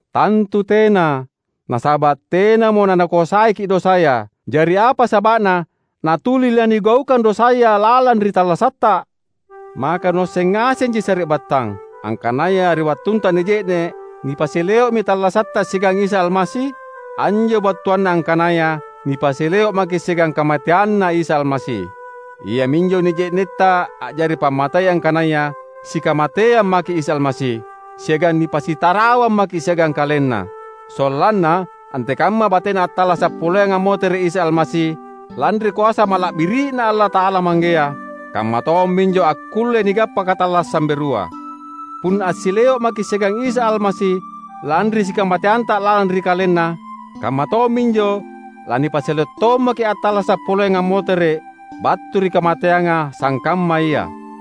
Tantu tena! Nasaba’ tenamo nanakoasaiki’ dosaya. Jari apa saba’na natuli lanigaukang dosaya lalang ri tallasatta? Maka nuasseng ngasenji sari’battang, angkanaya ri wattunta nije’ne’ nipasileo’mi tallasatta siagang Isa Almasi? Anjo battuanna angkanaya nipasileo’ maki’ siagang kamateanNa Isa Almasi. Iaminjo nije’netta a’jari pammatei angkanaya sikamateang maki’ Isa Almasi, siagang nipasitarawang maki’ siagang KalenNa; sollanna, antekamma batena attallasa’ poleang ammotere’ Isa Almasi lanri koasa mala’biri’Na Allata’ala Manggea, kamma tomminjo akkullei nigappa katallassang berua. Punna assileo’ maki’ siagang Isa Almasi lanri sikamateanta lalang ri KalenNa, kamma tomminjo lanipasileo’ tommaki’ attallasa’ poleang ammotere’ battu ri kamateanga sangkamma Ia.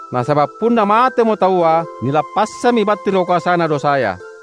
Nasaba’ punna matemo taua, nilappassammi battu ri koasana dosaya.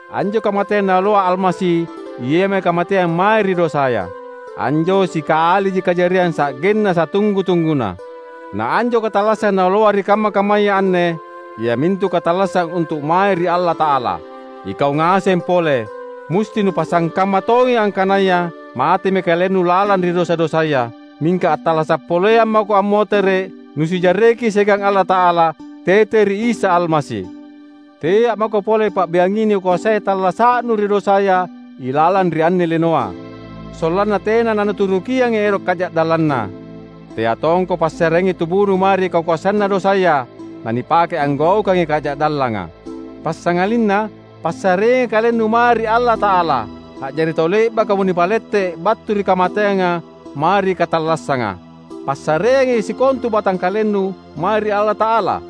Anjo kamateang Naoloa Almasi iami kamateang mae ri dosaya. Anjo sikaliji kajariang sa’genna satunggu-tungguna. Na anjo katallassang Naoloa ri kamma-kammaya anne, iamintu katallassang untu’ mae ri Allata’ala. Ikau ngaseng pole, musti nupasangkamma tongi angkanaya matemi kalennu lalang ri dosa-dosaya, mingka attallasa’ poleang mako ammotere’ nusijarreki siagang Allata’ala tete ri Isa Almasi. Tea’ mako pole pa’biangi nikoasai tallasa’nu ri dosaya ilalang ri anne linoa, sollanna tena nanuturukiangi ero’ kaja’dallanna. Tea tongko passareangi tubunu mae ri kakoasanna dosaya nanipake anggaukangi kaja’dallanga. Passangalinna passareangi kalennu mae ri Allata’ala, a’jari tau le’bakamo nipalette’ battu ri kamateanga mae ri katallassanga. Passareangi sikontu batangkalennu mae ri Allata’ala,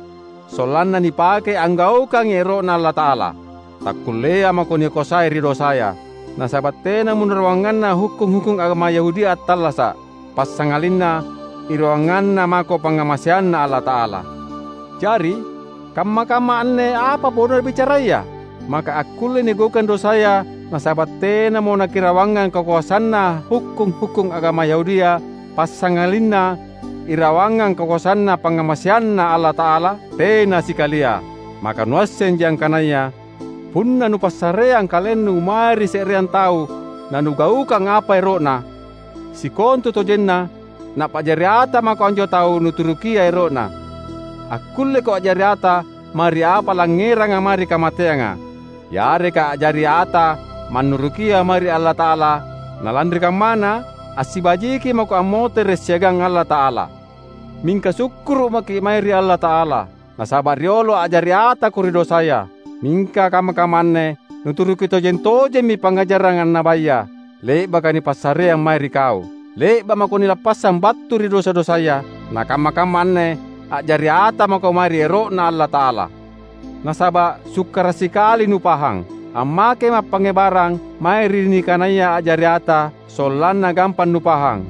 sollanna nipakei anggaukangi ero’Na Allata’ala. Takkullea mako nikoasai ri dosaya, nasaba’ tenamo nurawanganna hukkung-hukkung agama Yahudia attallasa’, passangalinna irawanganna mako pangngamaseanNa Allata’ala. Jari, kamma-kamma anne apa bodona bicaraya? Maka akkullei nigaukang dosaya nasaba’ tenamo nakirawangang kakoasanna hukkung-hukkung agama Yahudia passangalinna irawangang kakoasanNa pangngamaseanNa Allata’ala? Tena sikalia! Maka nuassenji angkanaya punna nupassareang kalennu mae ri se’reang tau nanugaukang apa ero’na, sikontutojenna napa’jari ata mako anjo tau nuturukia ero’na? Akkulleko a’jari ata mae ri apa langngeranga mae ri kamateanga, yareka a’jari ata mannurukia mae ri Allata’ala nalanri kammana assibajiki mako ammotere’ siagang Allata’ala. Mingka sukkuru’ maki’ mae ri Allata’ala! Nasaba’ riolo a’jari atako ri dosaya, mingka kamma-kamma anne nuturuki tojeng-tojemmi pangngajarang annabaya, le’baka nipassareang mae ri kau. Le’ba’ mako nilappassang battu ri dosa-dosaya, nakamma-kamma anne a’jari ata mako mae ri ero’Na Allata’ala. Nasaba’ sukkara’ sikali nupahang, ammakema’ pangngebarang mae ri nikanaya a’jari ata sollanna gampang nupahang.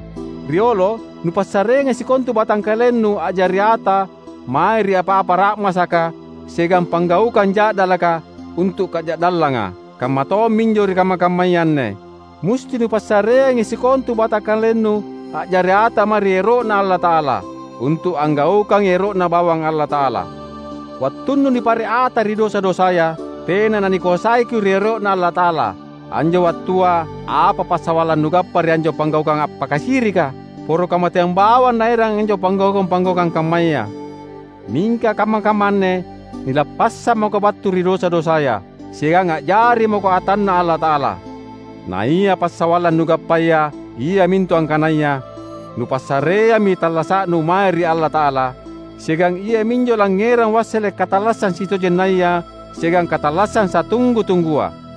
Riolo nupassareangi sikontu batangkalennu a’jari ata mae ri apa-apa ra’masaka siagang panggaukang ja’dalaka untu’ kaja’dallanga. Kamma tomminjo ri kamma-kammaya anne, musti nupassareangi sikontu batangkalennu a’jari ata mae ri ero’Na Allata’ala, untu’ anggaukangi ero’Na bawang Allata’ala. Wattunnu nipare’ ata ri dosa-dosaya, tena nanikoasaiko ri ero’Na Allata’ala. Anjo wattua apa passawallang nugappa ri anjo panggaukang appakasirika? Poro kamateang bawang naerang anjo panggaukang-panggaukang kammaya! Mingka kamma-kamma anne nilappassang mako battu ri dosa-dosaya, siagang a’jari mako atanNa Allata’ala. Naia passawallang nugappaya iamintu angkanaya nupassareammi tallasa’nu mae ri Allata’ala, siagang iaminjo langngerang wassele’ katallassang sitojennaya siagang katallassang satunggu-tunggua.